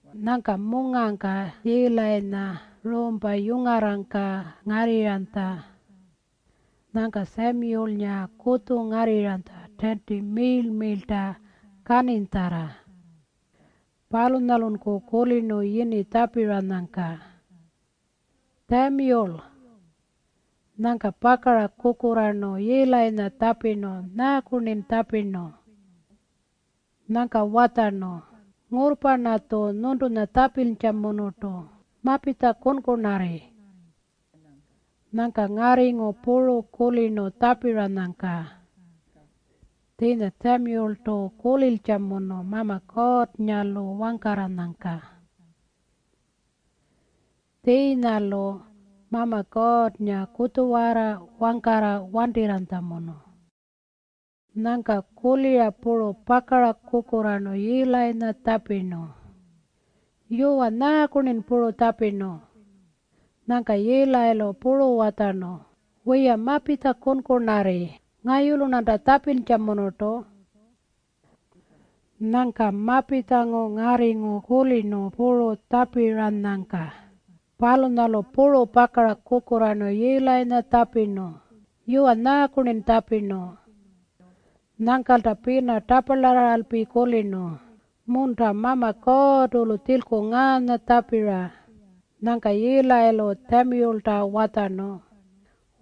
Nyangka mungangka Yiilayinya ruumpa yungarrangka ngarrirranytja. Nyangka Tjamiyulnga kutju ngarrirranytja tiinti miirl-miirlta kaninytjarra. Palunyalunku kulirnu yini tjapiranyangka, “Tjamiyul.” Nyangka pakara kukurraarnu Yiilayinya tjapirnu, “Nyaaku-rnin tjapirnu?” Nyangka watjarnu, “Ngurrpa-rnatju nyuntunya tjapintjamunurtu. Mapitja kunkunarri.” Nyangka ngarringu puru kulirnu tjapiranyangka. Tjiinya Tjamiyultu kulintjamunu Mama Kuurrnga-lu wangkarranyangka. Tjiinya-lu Mama Kuurrnga kutjuwarra wangkarra wantirranytjamunu. Nyangka kulira puru pakara kukurraarnu Yiilayinya tjapirnu, “Yuwa, nyaaku-rnin puru tjapirnu?” Nyangka Yiilayilu puru watjarnu, “Wiya, mapitja kunkunarri. Ngayulu-rnanta tjapintjamunurtu.” Nyangka mapitjangu ngarringu kulirnu puru tjapiranyangka. Palunyalu puru pakara kukurraarnu Yiilayinya tjapirnu, “Yuwa, nyaaku-rnin tjapirnu?” Nyangkalta pina taparlarraralpi kulirnu, “Munta! Mama Kuurrtu-lu tjilku ngaanya tjapira.” Nyangka Yiilayilu Tjamiyulta watjarnu,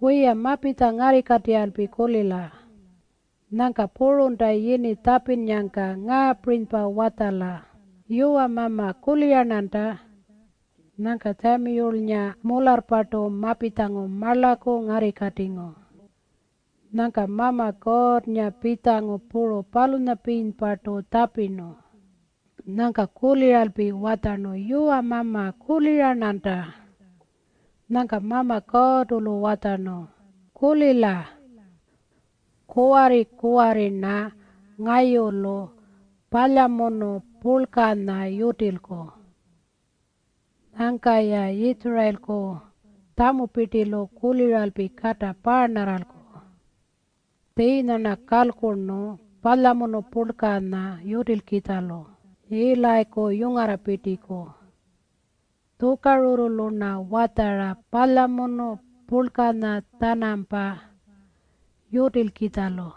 “Wiya, mapitja ngarrikatirralpi kulila. Nyangka purunta yini tjapinnyangka ngaapirinypa watjala, ‘Yuwa Mama, kulira-rnanta.’” Nyangka Tjamiyulnga mularrpartu mapitjangu marlaku ngarrikatingu. Nyangka Mama Kuurrnga pitjangu puru palunyapirinypartu tjapirnu. Nyangka kuliralpi watjarnu, “Yuwa Mama, kulira-rnanta.” Nyangka Mama Kuurrtu-lu watjarnu, “Kulila. Kuwarri-kuwarri-rna ngayulu palyamunu purlkanya yutilku. Nyangka-ya Yitjurayilku tjamupirtilu kuliralpi kata paarnarralku. Tjiinya-rna kalkurnu palyamunu purlkanya yutilkitjalu Yiilayiku yungarrapirtiku. Tjukarurrulu-rna watjara palyamunu purlkanya-tjanampa yutilkitjalu.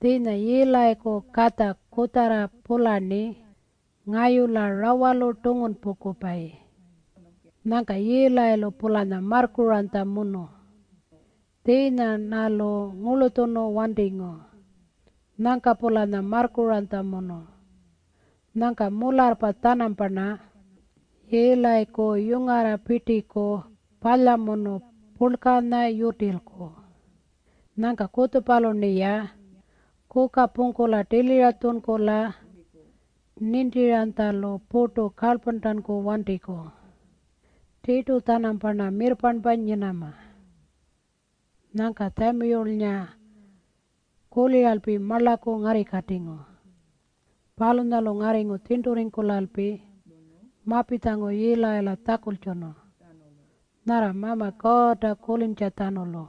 Tjiinya Yiilayiku katja kutjarra-pularni ngayula rawalu tungunpungkupayi. Nyangka Yiilayilu-pulanya marrkuranytjamunu. Tjiinya-rnalu ngurlutjunu wantingu. Nyangka-pulanya marrkuranytjamunu. Nyangka mularrpa-tjanamparna Yiilayiku yungarrapirtiku palyamunu purlkanya yutilku. Nyangka kutjupalu-rniya kuka pungkula tilira tjunkula nintiranytjalu purtu kalyparntanku wantiku. Tirtu-tjanamparna mirrparnpa nyinama.” Nyangka Tjamiyulnga kuliralpi marlaku ngarrikatingu. Palunyalu ngarringu tjirnturringkulalpi mapitjangu Yiilayila tjakultjunu nyarra Mama Kuurrta kulintjatjanulu.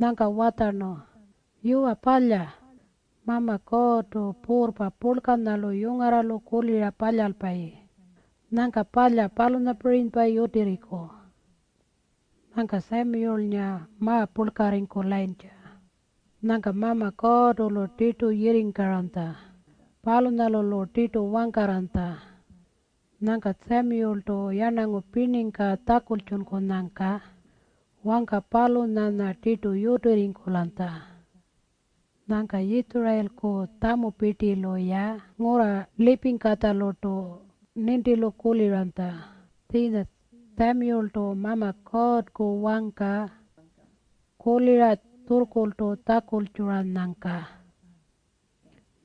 Nyangka watjarnu, “Yuwa palya. Mama Kuurrtu, Puurrpa Purlkanyalu yungarralu kulira palyalpayi. Nyangka palya palunyapirinypa yutirriku.” Nyangka Tjamiyulnga ma-purlkarringkulayintja. Nyangka Mama Kuurrtu-lu tirtu yirringkaranytja. Palunyalu-lu tirtu wangkarranytja. Nyangka Tjamiyultu yarnangu pirningka tjakultjunkunyangka wangka palunyanya tirtu yutirringkulanytja. Nyangka Yitjurayilku tjamupirtilu-ya ngurra lipingkatjalurtu nintilu kuliranytja tjiinya Tjamiyultu Mama Kuurrku wangka kulira tjurrkurltu tjakultjuranyangka.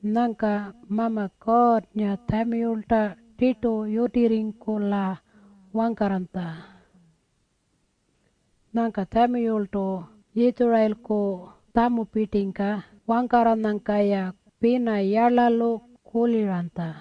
Nyangka Mama Kuurrnga Tjamiyulta tirtu yutirringkula wangkarranytja. Nyangka Tjamiyultu Yitjurayilku tjamupirtingka wangkarranyangka-ya pina yarlalu kuliranytja.